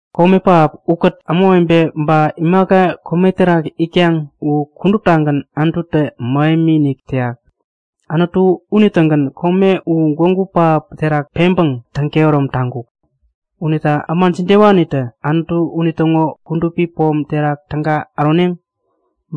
Kome pähap ukät ämawebe ba imaka kome terak itkaŋ u kuduptagän Anututä mähemi-inik täyak. Anutu unitägän kome u gwägu pähap terak peŋpäŋ täŋ-kehärom taŋkuk. Unita äma jidewanitä Anutu unitäŋo kudupi pom terak täga äroneŋ?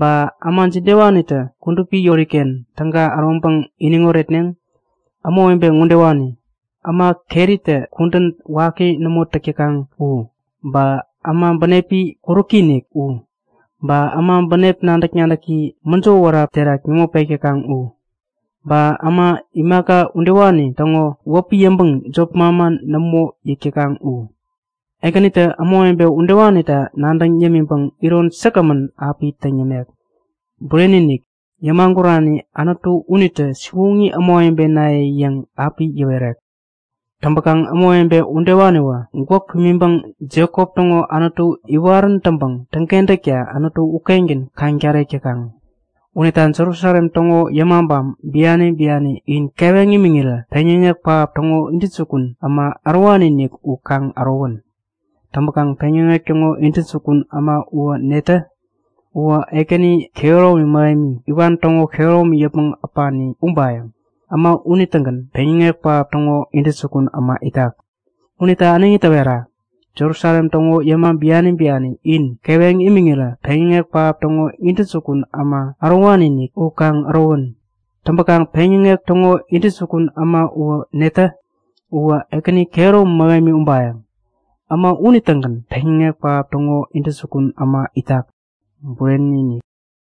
Ba äma jidewanitä kudupi yoriken täga äroŋpäŋ iniŋ oretneŋ? Ämawebe ŋodewani; Äma keritä kudän waki nämo täk täkaŋ u, ba äma bänepi kuräki-inik u. Ba äma bänep nadäk-nadäki mäjo wära terak nämo pek täkaŋ u, ba äma imaka udewani täŋo wäpi yäŋpäŋ jop manman nämo yäk täkaŋ u. Ekänitä ämawebe udewanita nadäŋ yämiŋpäŋ iron säkgämän api täŋ yämek. Bureni-inik, yämagurani Anutu unitä Siwoŋi ämawebenaye yäŋ api yäwerek. Täŋpäkaŋ ämawebe udewaniwä gwäk pimiŋpäŋ Jekop täŋo Anutu iwarän täŋpäŋ täŋkentäkta Anutu ukengän kaŋ-tarek täkaŋ. Unita Jerusalem täŋo yämabam biani biani, in keweŋ imiŋirä peŋyäŋek pähap täŋo intäjukun äma ärowani-inik u kaŋ ärowän! Täŋpäkaŋ peŋyäŋek täŋo intäjukun äma uwä netä? Uwä Ekäni kehäromi mähemi, iwan täŋo kehäromi yäpmäŋ äpani ubayäŋ! Äma unitägän peŋyäŋek pähap täŋo intäjukun äma itak. Unita äneŋi täwera! Jerusalem täŋo yäma biani biani, in keweŋ imiŋirä peŋyäŋek pähap täŋo intäjukun äma ärowani-inik u kaŋ ärowän! Täŋpäkaŋ peŋyäŋek täŋo intäjukun äma uwä netä? Uwä Ekäni kehäromi mähemi ubayäŋ! Äma unitägän peŋyäŋek pähap täŋo intäjukun äma itak. Bureni-inik!